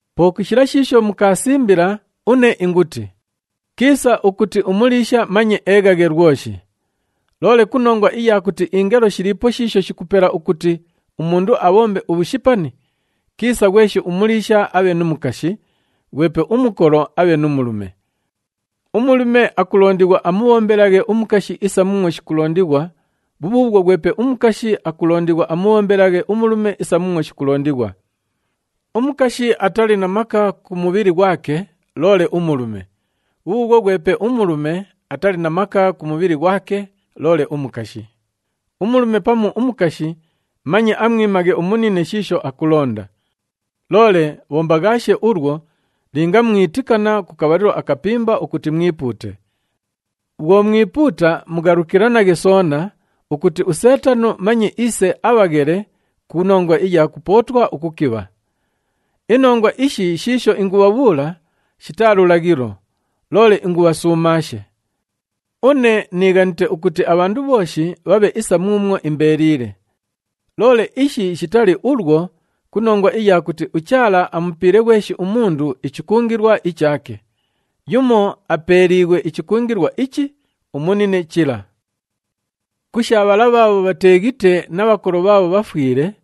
Po ku shila shiisho mukaasimbila, une inguti, “Kiisa ukuti umuliisha manye eeghaghe lwoshi.” Loole ku nongwa iya kuti ingelo shiliipo shiisho shikupela ukuti umundu abhombe ubhushipani, kiisa ghweshi umuliisha abhe nu mukashi, ghwepe umukolo abhe nu mulume. Umulume akulondighwa amubhombelaghe umukashi isa muumwo shikulondighwa, bhubhuubhwo ghwepe umukashi akulondighwa amubhombelaghe umulume isa muumwo shikulondighwa. Umukashi atali na maka ku mubhili ghwake loole umulume, bhubhuubhwo ghwepe umulume atali na maka ku mubhili ghwake loole umukashi. Umulume pamu umukashi manye amwimaghe umunine shiisho akulonda. Loole bhombaghaashe ulwo linga mwitikana ku kabhalilo akapimba ukuti mwipuute. Bhwo mwipuuta, mughalukilanaghe soona ukuti uSeetano manye iise abhaghele ku nongwa iya kupootwa ukukibha. Inongwa ishi shiisho ingubhabhuula shitaa lulaghilo, loole ingubhasuumaashe. Une niighanite ukuti abhandu bhooshi bhabhe isa muumwo imbeeliile. Loole ishi shitali ulwo ku nongwa iya kuti uChaala amupiile ghweshi umundu ichikungilwa ichaake. Yumo apeeliighwe ichikungilwa ichi, umunine chila. Ku sha bhala bhaabho bhateeghite na bhakolo bhaabho bhafwile,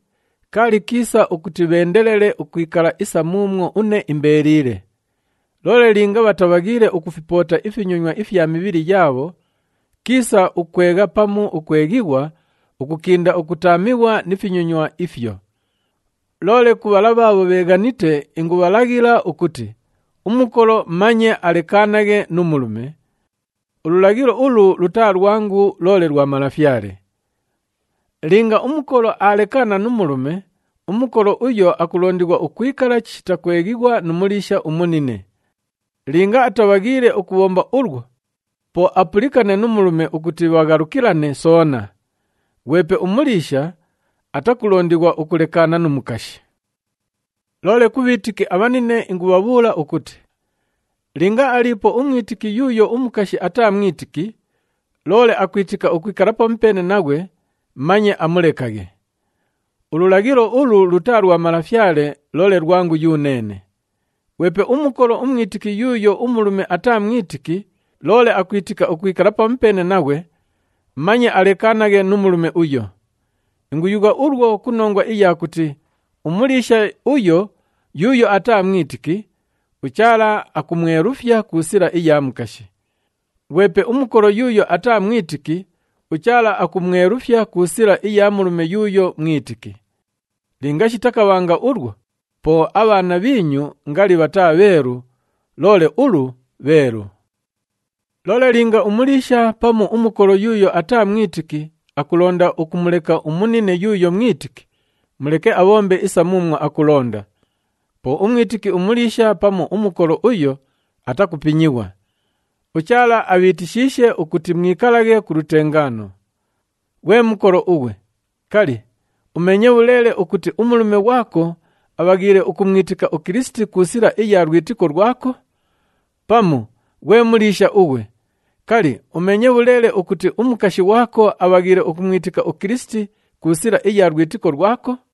kaali kiisa ukuti bheendelele ukwikala isa muumwo une imbeeliile. Loole linga bhatabhaghiile ukufipoota ifinyonywa ifya mibhili yaabho, kiisa ukwegha pamu ukweghighwa ukukinda ukutaamighwa ni finyonywa ifyo. Loole ku bhala bhaabho bheeghanite, ingubhalaghila ukuti umukolo manye alekaanaghe nu mulume. Ululaghilo ulu lutaa lwangu loole lwa Malafyale. Linga umukolo aalekaana nu mulume, umukolo uyo akulondighwa ukwikala chishita kweghighwa nu muliisha umunine. Linga atabhaghiile ukubhomba ulwo, po apulikane nu mulume ukuti bhaghalukilane soona. Ghwepe umuliisha atakulondighwa ukulekaana nu mukashi. Loole ku bhiitiki abhanine ingubhabhuula ukuti, linga aliipo umwitiki yuuyo umukashi ataa mwitiki, loole akwitika ukwikala pamupeene naghwe, manye amulekaghe. Ululaghilo ulu lutaa lwa Malafyale loole lwangu yuneene. Ghwepe umukolo umwitiki yuuyo umulume ataa mwitiki loole akwitika ukwikala pamupeene naghwe, manye alekaanaghe nu mulume uyo. Inguyugha ulwo ku nongwa iya kuti umuliisha uyo yuuyo ataa mwitiki, uChaala akumwelufya ku sila iya mukashi. Ghwepe umukolo yuuyo ataa mwitiki, uChaala akumwelufya ku sila iya mulume yuuyo mwitiki. Linga shitakabhanga ulwo, po abhaana bhiinyu ngali bhataa bheelu, loole ulu bheelu. Loole linga umuliisha pamu umukolo yuuyo ataa mwitiki akulonda ukumuleka umunine yuuyo mwitiki, muleke abhombe isa muumwo akulonda. Po umwitiki umuliisha pamu umukolo uyo atakupinyighwa. UChaala abhiitishiishe ukuti mwikalaghe ku lutengaano. Ghwe mukolo ughwe, kali, umeenye bhuleele ukuti umulume ghwako abhaghiile ukumwitika uKilisiti ku sila iya lwitiko lwako? Pamu, ghwe muliisha ughwe, kali, umeenye bhuleele ukuti umukashi ghwako abhaghiile ukumwitika uKilisiti ku sila iya lwitiko lwako?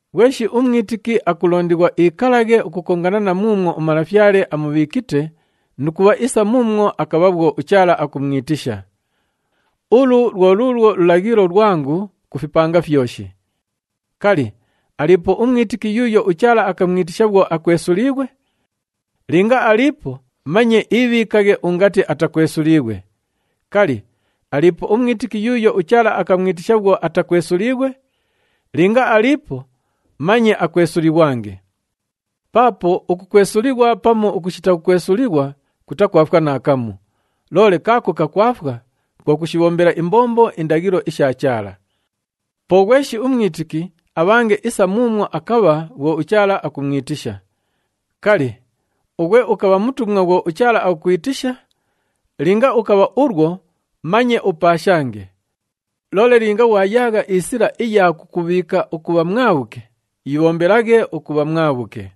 Ghweshi umwitiki akulondighwa iikalaghe ukukongana na muumwo uMalafyale amubhiikite nu kubha isa muumwo akabha bhwo uChaala akumwitisha. Ulu lwo luulwo lulaghilo lwangu ku fipanga fyoshi. Kali, aliipo umwitiki yuuyo uChaala akamwitisha bhwo akwesuliighwe? Linga aliipo, manye iibhiikaghe ungati atakwesuliighwe. Kali, aliipo umwitiki yuuyo uChaala akamwitisha bhwo atakwesuliighwe? Linga aliipo manye akwesulighwange. Paapo ukukwesulighwa pamu ukushita kukwesulighwa kutakwafwa naakamu, loole kaako kakwafwa kwo kushibhombela imbombo indaghilo isha Chaala. Po ghweshi umwitiki abhange isa muumwo akabha bhwo uChaala akumwitisha. Kali, ughwe ukabha mutumwa bhwo uChaala akukwitisha? Linga ukabha ulwo manye upaashange. Loole linga ghwayaagha isila iya kukubhiika ukubha mwabhuke, yibhombelaghe ukubha mwabhuke.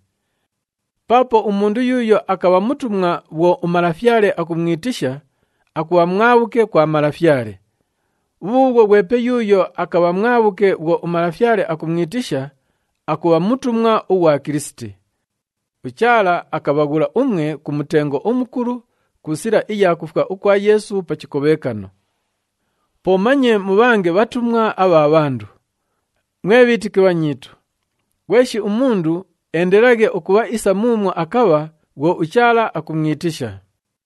Paapo umundu yuuyo akabha mutumwa bhwo uMalafyale akumwitisha, akubha mwabhuke kwa Malafyale. Bhubhuubhwo ghwepe yuuyo akabha mwabhuke bhwo uMalafyale akumwitisha, akubha mutumwa ughwa Kilisiti. UChaala akabhaghula umwe ku mutengo umukulu ku sila iya kufwa ukwa Yeesu pa chikobhekano. Po manye mubhange bhatumwa abha bhandu. Mwe bhiitiki bhanyiitu, ghweshi umundu eendelelaghe ukubha isa muumwo akabha bhwo uChaala akumwitisha.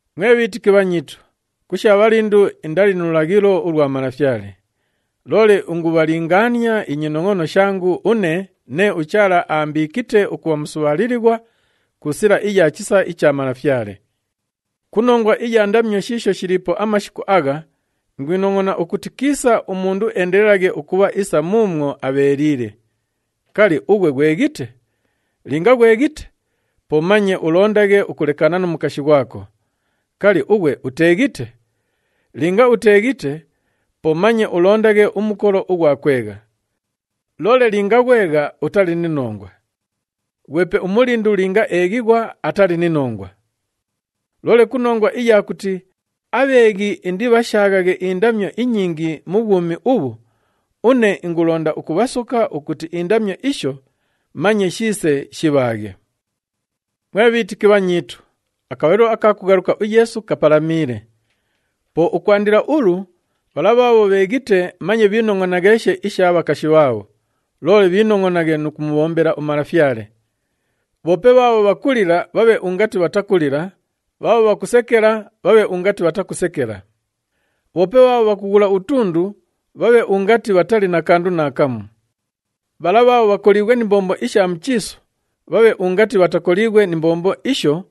Mwe bhiitiki bhanyiitu, ku sha bhalindu, indali nu lulaghilo ulwa Malafyale, loole ingubhalingaania inyinongʼono shangu une nee uChaala aambiikite ukubha musubhaalilighwa ku sila iya chisa icha Malafyale. Ku nongwa iya ndamyo shiisho shiliipo amashiku agha, ingwinongʼona ukuti kiisa umundu eendelelaghe ukubha isa muumwo abheeliile. Kali, ughwe ghweghite? Linga ghweghite, po manye ulondaghe ukulekaana nu mukashi ghwako. Kali, ughwe uteeghite? Linga uteeghite, po manye ulondaghe umukolo ughwa kwegha. Loole linga ghwegha, utali ni nongwa. Ghwepe umulindu linga eeghighwa, atali ni nongwa. Loole ku nongwa iya kuti abheeghi indibhashaaghaghe indamyo inyingi mu bhwumi ubhu, une ingulonda ukubhasoka ukuti indamyo isho manye shiise shibhaaghe. Mwe bhiitiki bhanyiitu, akabhalilo aka kughaluka uYeesu kapalamiile. Po ukwandila ulu, bhala bhaabho bheeghite manye bhiinongʼonagheeshe isha bhakashi bhaabho, loole bhiinongʼonaghe nu kumubhombela uMalafyale. Bhoope bhaabho bhakulila bhabhe ungati bhatakulila, bhaabho bhakusekela bhabhe ungati bhatakusekela. Bhoope bhaabho bhakughula utundu bhabhe ungati bhatali na kandu naakamu. Bhala bhaabho bhakoliighwe ni mbombo isha mu chiisu, bhabhe ungati bhatakoliighwe ni mbombo isho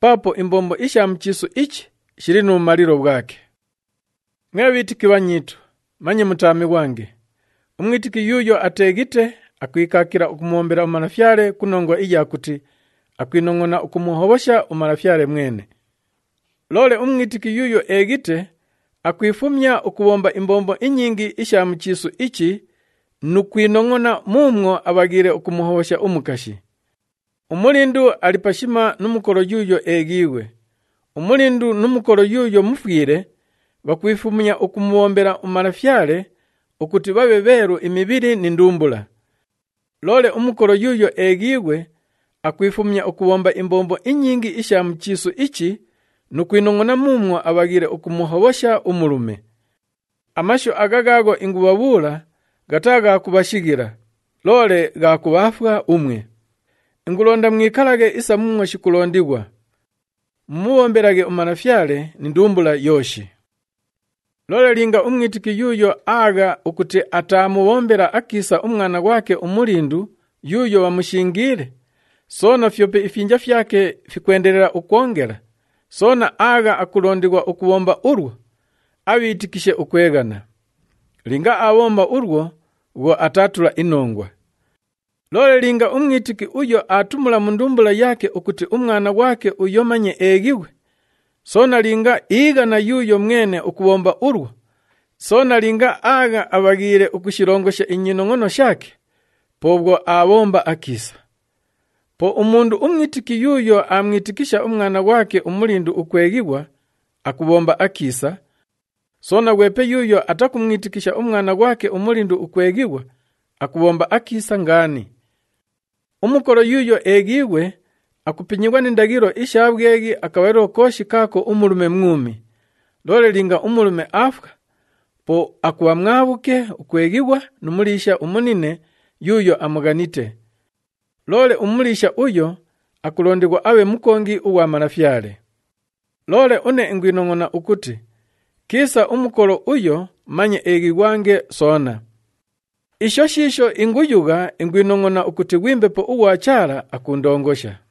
paapo imbombo isha mu chiisu ichi shili nu bhumalilo bhwake. Mwe bhiitiki bhanyiitu, manye mutaamighwange. Umwitiki yuuyo ateeghite akwikaakila ukumubhombela uMalafyale ku nongwa iya kuti akwinongʼona ukumuhobhosha uMalafyale mwene. Loole umwitiki yuuyo eeghite, akwifumya ukubhomba imbombo inyingi isha mu chiisu ichi nu kwinongʼona muumwo abhaghiile ukumuhobhosha umukashi. Umulindu ali pashima nu mukolo yuuyo eeghiighwe. Umulindu nu mukolo yuuyo mufwile bhakwifumya ukumubhombela uMalafyale ukuti bhabhe bheelu imibhili ni ndumbula. Loole umukolo yuuyo eeghiighwe, akwifumya ukubhomba imbombo inyingi isha mu chiisu ichi nu kwinongʼona muumwo abhaghiile ukumuhobhosha umulume. Amashu agha ghaagho ingubhabhuula ghataa gha kubhashighila, loole gha kubhaafwa umwe. Ingulonda mwikalaghe isa muumwo shikulondighwa. Mumubhombelaghe uMalafyale ni ndumbula yooshi. Loole linga umwitiki yuuyo aagha ukuti ataamubhombela akiisa umwana ghwake umulindu yuuyo bhamushingiile, soona fyope ifyinja fyake fikwendelela ukwongela, soona aagha akulondighwa ukubhomba ulwo, abhiitikishe ukweghana. Linga aabhomba ulwo bhwo ataatula inongwa. Loole linga umwitiki uyo aatumula mu ndumbula yaake ukuti umwana ghwake uyo manye eeghighwe, soona linga iighana yuuyo mwene ukubhomba ulwo, soona linga aagha abhaghiile ukushilongosha inyinongʼono shaake, po bhwo aabhomba akiisa. Po umundu umwitiki yuuyo aamwitikisha umwana ghwake umulindu ukweghighwa, akubhomba akiisa. Soona, ghwepe yuuyo atakumwitikisha umwana ghwake umulindu ukweghighwa, akubhomba akiisa ngaani. Umukolo yuuyo eeghiighwe, akupinyighwa ni ndaghilo isha bhweghi akabhalilo kooshi kaako umulume mwumi. Loole linga umulume aafwa, po akubha mwabhuke ukweghighwa nu muliisha umunine yuuyo amughanite. Loole umuliisha uyo akulondighwa abhe mukongi ughwa Malafyale. Loole une ingwinongʼona ukuti kiisa umukolo uyo manye eeghighwange soona. Isho shiisho inguyugha ingwinongʼona ukuti ghwi Mbepo ughwa Chaala akuundongosha.